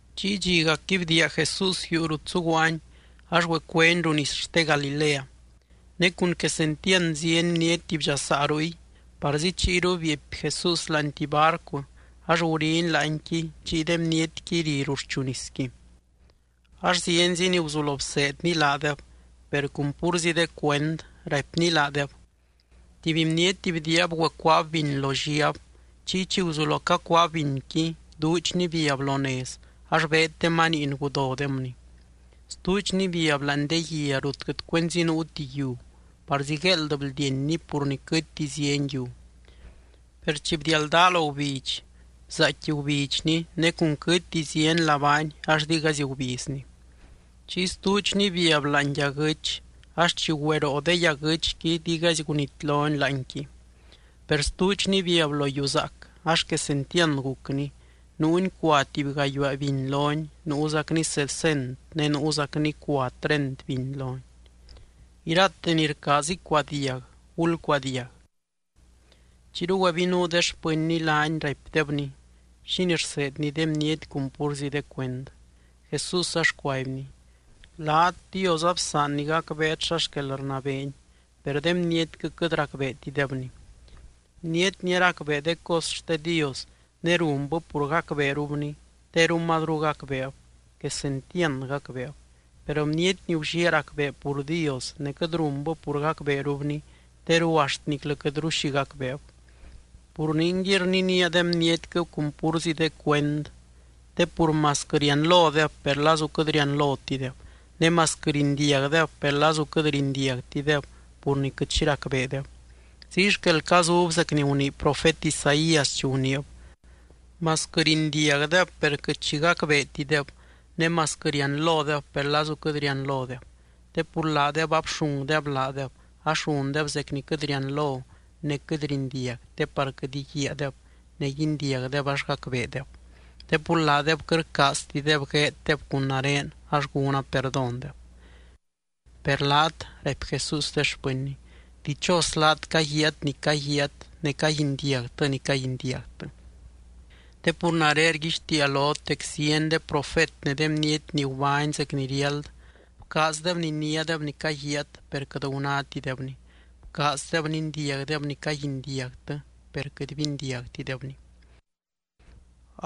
Chiy dxiacqui bdiia Jesús yuu rut zuguaany ax güecueny ruu nis xte Galilea. Ne cun quesentiand zieny bniety bdxasaa ruy, parzi chiyru bieepy Jesús láani tuby barcu ax guriny láanqui chiy de bnietqui ri ruxchu nisqui. Ax zienzi ni guzulo bseedny laadeb per cun púrzi de cuend, raipny laadeb: —Tuby bniety bdiiab güecuaab biny lo lliab. Chiy chi guzulo cacuaab binqui, duudxni biab lo nez ax beed de maniin gudodemni. Stuudxni biab láani de guia rut quɨt cuenzi nuuti yiu, parzi gueeld bldienni pur ni quɨtti zieny yiu. Per chi bdialdaa lo gubidx, bzaaicqui gubidxni, ne cun quɨtti zieny labaani ax digaizy gubizni. Chiy stuudxni biab láani yaguɨ́ch, ax chi güeroo de yaguɨ́chqui digaizy gunitloni láanqui. Per stuudxni biab lo yiu zaac, ax quesentiand gucni. Nuuni cua tuby gayuaa biny loni, nuuzacni sesent ne nuuzacni cua treint biny loni. Irate ni rcaaz icuadiag, ¡gulcuadiag! Chiyru güebinuu de xpɨnny laany raipdebny, xínii rseedny de bniety cun púrzi de cuend. Jesús ax cuaibny: —Laat, Dios absaanny gacbeet xa xquel rnabeeny, per de bnietquɨ quɨt racbeetidebni. Bniety ni aracbee de cos xte Dios ne runbɨ pur gacbeerubni, teru mazru gacbeeb, quesentiand gacbeeb. Per bniety ni gulliaa racbee pur Dios ne quɨt runbɨ pur gacbeerubni, teru axt niclɨ quɨtru xi gacbeeb. Pur ningui rninía de bnietquɨ cun púrzi de cuend. Te pur masquɨ rianlodeb, per lazu quɨt rianlotideb. Ne masquɨ rindiagdeb, per lazu quɨt rindiagtideb pur ni quɨt xi racbeedeb. Ziy xquel cazub zec ni gunii profet Isaías chi guniib: Masquɨ rindiagdeb, per quɨt xi gacbeetideb. Ne masquɨ rianlodeb, per lazu quɨt rianlodeb. Te pur laadeb abxungdeb laadeb, ax rundeb zec ni quɨt rianlo ne quɨt rindiag te par quɨt íguiaadeb ne guindiagdeb ax gacbeedeb. Te pur laadeb quɨt rcaaztideb gueeddeb cun nare ax gúna perdóndeb. ’Per laat —raipy Jesús de xpɨnny— dichos laat caguiaat ni caguiaat ne caguindiagtɨ ni caguindiagtɨ. Te pur nare rguixtiia lot dec zieny de profet ne de bniety ni gubány zec ni riáld, bcaazdeb niniádeb ni caguiaat per quɨt gunátidebni. Bcaazdeb nindiagdeb ni caguindiagtɨ, per quɨt bindiagtidebni.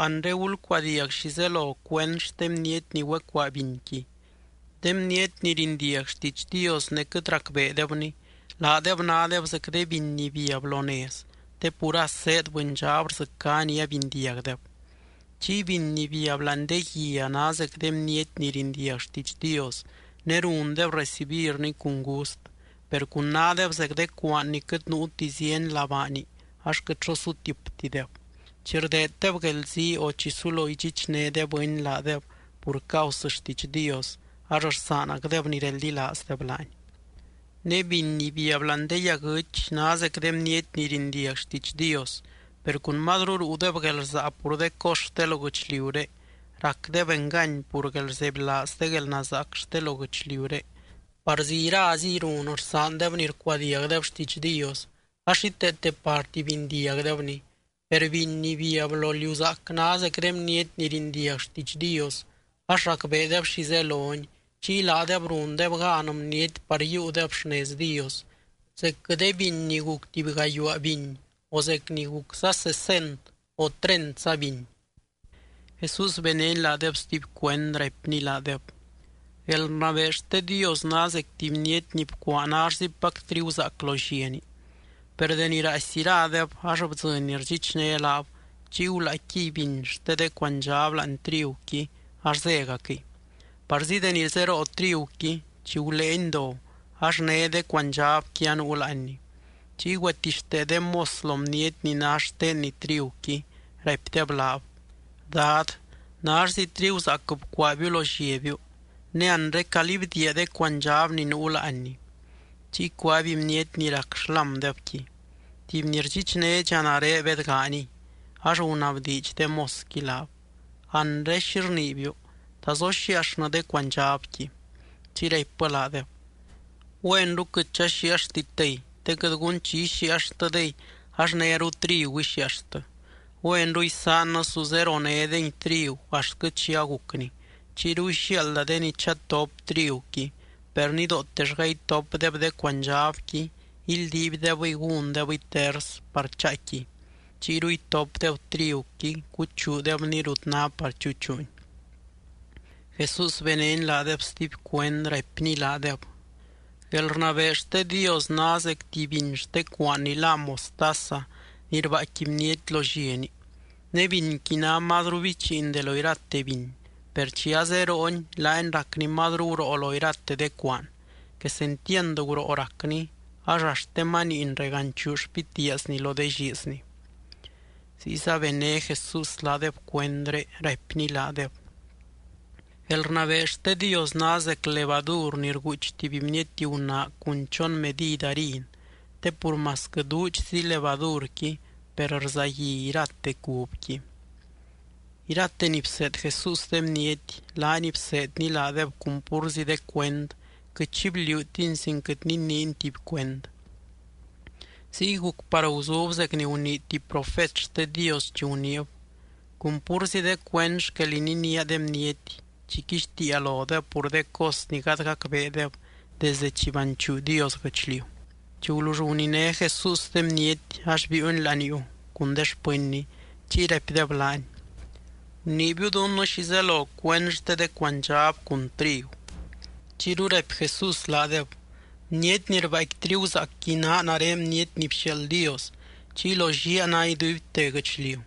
’Anre gulcuadiag xi zelo cuend xte bniety ni güecuaa binqui. De bniety ni rindiag xtiidx Dios ne quɨt racbeedebni, laadeb nádeb zec de biny ni biab lo nez te pur as zéed bɨndxab rdzɨcá ni abindiagdeb. Chiy biny ni biab láani de guia ná zec de bniety ni rindiag xtiidx Dios ne rundeb recibirni cun gust, per cun nádeb zec de cuaan ni quɨt nuuti zieny labaani ax quɨt xo sutiptideb. Chi rdeeddeb guelzii o chi sulo idxichné de bɨny laadeb pur causɨ xtiidx Dios ax rsaanacdeb ni reldilaazdeb laany. ’Ne biny ni biab láani de yaguɨch ná zec de bniety ni rindiag xtiidx Dios, per cun mazru ruudeb guelrsaa pur de cos xte lo guɨchliuré, racdeb engany pur guelrzebylaaz de guelnazaac xte lo guɨchliuré. Parzi iraziy run rsaandeb ni rcuadiagdeb xtiidx Dios, ax xíteete parti bindiagdebni. Per biny ni biab lo liu zaac ná zec de bniety ni rindiag xtiidx Dios ax racbeedeb xi zeloni chiy laadeb rundeb gan bniety par yiiudeb xnez Dios, zecquɨ de biny ni guc tuby gayuaa biny o zec ni gucza sesent o treintsa biny. Jesús benény laadeb stuby cuend, raipny laadeb: —Guelrnabee xte Dios ná zec tuby bniety ni bcuaa nallzipac triguzaac lo lliani. Per deni raaisy iradeb ax bdzɨny ni rdxichné laab, chiy gulaaicquiy biny xte de cuandxab láani triguqui ax zégacquɨy. Parzi deni zeroo triguqui, chi guléeni do ax né de cuandxabqui anuu láanni. Chiy güetixtee de mos lo bniety ni ná xtenni triguqui, raipdeb laab: “Dad, nallzi triguzaac bcuaabiu lo lliabiu, ne anre, ¿calí bdiia de cuandxab ni nuu láanni?” Chiy cuaby bniety ni rac xlámdebqui: “Tuby ni rdxichnédxa nare bedganiy.” Ax gunabdiidx de mosqui laab: “Anre, ¿xi rniibiu? ¿Ta zoxiiaxnɨ de cuandxabqui?” Chiy raipbɨ laadeb: “Güenru quɨt chaxiiaxtitdey te quɨt gun chi ixiiaxtɨdey, ax néru trigu ixiiaxtɨ. Güenru isaannɨ su zeronédengui trigu axtquɨ chi agucni. Chiyru ixiaalda de ni chatop triguqui, per nidootellga itopdeb de cuandxabqui, ildiibdebɨy gúndebɨy ters par chaaicquiy. Chiyru itopdeb triguqui, cuchuudebni rut ná par chuchuuni.” Jesús benény laadeb stuby cuend, raipny laadeb: —Guelrnabee xte Dios ná zec tuby biny xte cuaan ni lá mostaza ni rbaaicqui bniety lo lliani. Ne binqui ná mazru bichiin de lo irate biny, per chi azerooni laani racni mazru guroo lo irate de cuaan. Quesentiand guroo racni ax axt de maniin reganchuu xpitiaazni lo de lliizni. Ziyza bené Jesús laadeb cuendré, raipny laadeb: —Guelrnabee xte Dios ná zec levadur ni rguuch tuby bniety gunaa cun chon medid harin te pur masquɨ duudxzi levadurqui, per rzagui irate cubqui. Irate ni bseed Jesús de bniety, laany bseedny laadeb cun púrzi de cuend, quɨt xi bliuutiny sin quɨt niniiny tuby cuend. Ziy guc par guzub zec ni gunii tuby profet xte Dios chi guniib: Cun púrzi de cuend xquel ininía de bniety chi quixtiia lodeb pur de cos ni gady gacbeedeb desde chi banchuu Dios guɨchliu. Chi gulull guniné Jesús de bniety, ax biiuny laniuu cun de xpɨnny. Chiy raipdeb laany: —Guniibiu dunnɨ xi zelo cuend xte de cuandxab cun trigu. Chiyru raipy Jesús laadeb: —Bniety ni rbaaicqui triguzaacqui naa nare Bniety ni bxiaald Dios, chiy lo lliaa ná iduibte guɨchliu.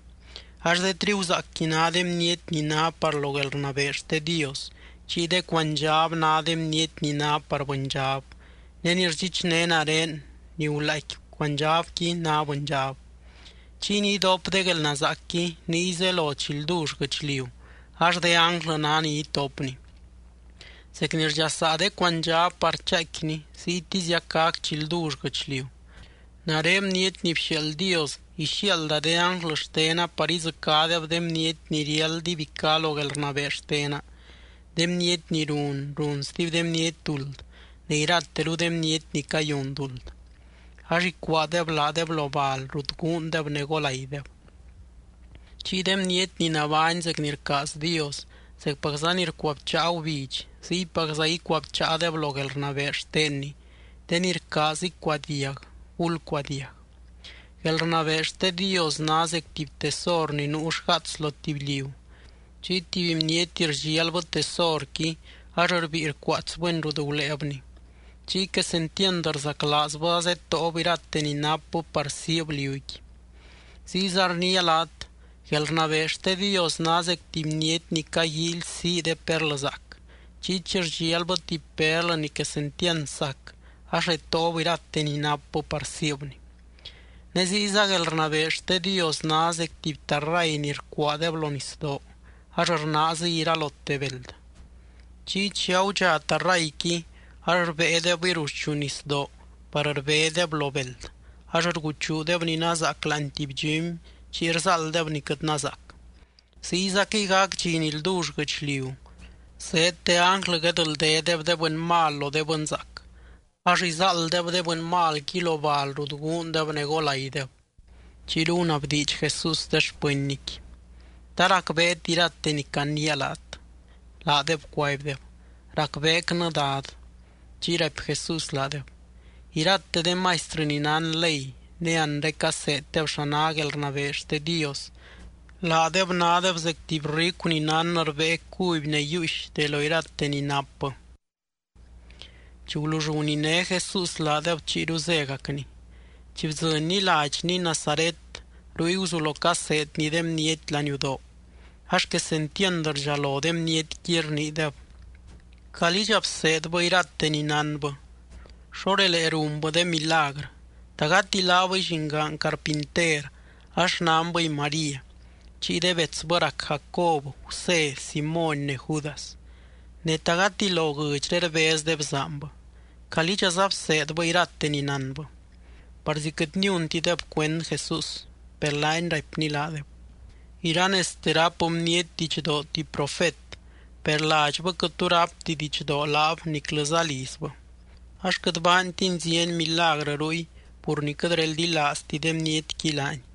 Ax de triguzaacqui ná de bniety ni ná par lo guelrnabee xte Dios. Chiy de cuandxab ná de bniety ni ná par bɨndxab ne ni rdxichné nare, ni gulaaicqui cuandxabqui ná bɨndxab. Chiy ni idop de guelnazaacqui niy zelo chi ldull guɨchliu, ax de ánglɨ ná ni itopni. Zec ni rdxasaa de cuandxab par chaaicquini, ziytiziac gac chi ldull guɨchliu. Nare Bniety ni bxiaald Dios ixiaalda de ánglɨ xtena par idzɨcádeb de bniety ni riáld ibicá lo guelrnabee xtena, de bniety ni run, run stuby de bniety duld ne irateru de bniety ni cayun duld. Ax icuaadeb laadeb lo bal rut guundeb ne golaideb. Chiy de bniety ni nabány zec ni rcaaz Dios, zecpacza ni rcuabcháa gubidx, ziypacza icuabcháadeb lo guelrnabee xtenny. De ni rcaaz icuadiag, ¡gulcuadiag! ’Guelrnabee xte Dios ná zec tuby tesor ni nuu xgaats lo tuby liu. Chiy tuby bniety rdxialbɨ tesorqui ax rbíi rcuaatsbɨni rut guléebni. Chiy quesentiand rzaclaazbɨ azetóob irate ni napbɨ par siib liuqui. ’Ziyza rniia laat: Guelrnabee xte Dios ná zec tuby bniety ni caguíily sii de perlɨzaac. Chiy chi rdxialbɨ tuby perlɨ ni quesentiand sac, ax retóob irate ni napbɨ par siibni. ’Ne ziyza guelrnabee xte Dios ná zec tuby tarray ni rcuaadeb lo nisdoo ax rnaaziy iralote beld. Chiy chi agudxa tarrayqui ax rbéedebɨy ruxchu nisdoo par rbédeb lo beld, ax rguchuudeb ni nazaac láani tuby dxumy chiy rzáalddeb ni quɨt nazaac. Ziyzaquɨy gac dxi ni ldull guɨchliu: Zeed de ánglɨ guedldédeb de bɨny mal lo de bɨnzaac. Ax izáalddeb de bɨny malqui lo bal rut guundeb ne golaideb. Chiyru gunabdiidx Jesús de xpɨnnyqui: —¿Ta racbeet irate ni caniia laat? Laadeb cuaibdeb: —Racbeecnɨ, Dad. Chiy raipy Jesús laadeb: —Irate de maistrɨ ni nán ley ne anre caseeddeb xa ná guelrnabee xte Dios, laadeb nádeb zec tuby ricu ni nán rbée cuby ne yiiux de lo irate ni napbɨ. Chi gulull guniné Jesús laadeb chiyru zégacny. Chi bdzɨnny ladxny Nazaret, ruy guzulo caseedny de bniety laniudoo. Ax quesentiand rdxalo de bnietqui, rniideb: —¿Calídxa bseedbɨ irate ni nánbɨ? ¿Xo relee runbɨ de milagrɨ? ¿Ta gati laabɨy llingaan carpinter ax xnanbɨy María, chiy de betsbɨ rac Jacob, Gusé, Simóny ne Judas? Ne, ¿ta gati lo guɨdxré rbez de bzaanbɨ? ¿Calídxaza bseedbɨ irate ni nánbɨ? Parzi quɨt niuntideb cuend Jesús. Per laany raipny laadeb: —Iranezte ráp bniety didxdoo tuby profet, per ladxbɨ quɨt tu rápti didxdoo laab niclɨza lizbɨ. Ax quɨt baantiny zieny milagrɨ ruy pur ni quɨt reldilaazti de bnietqui laany.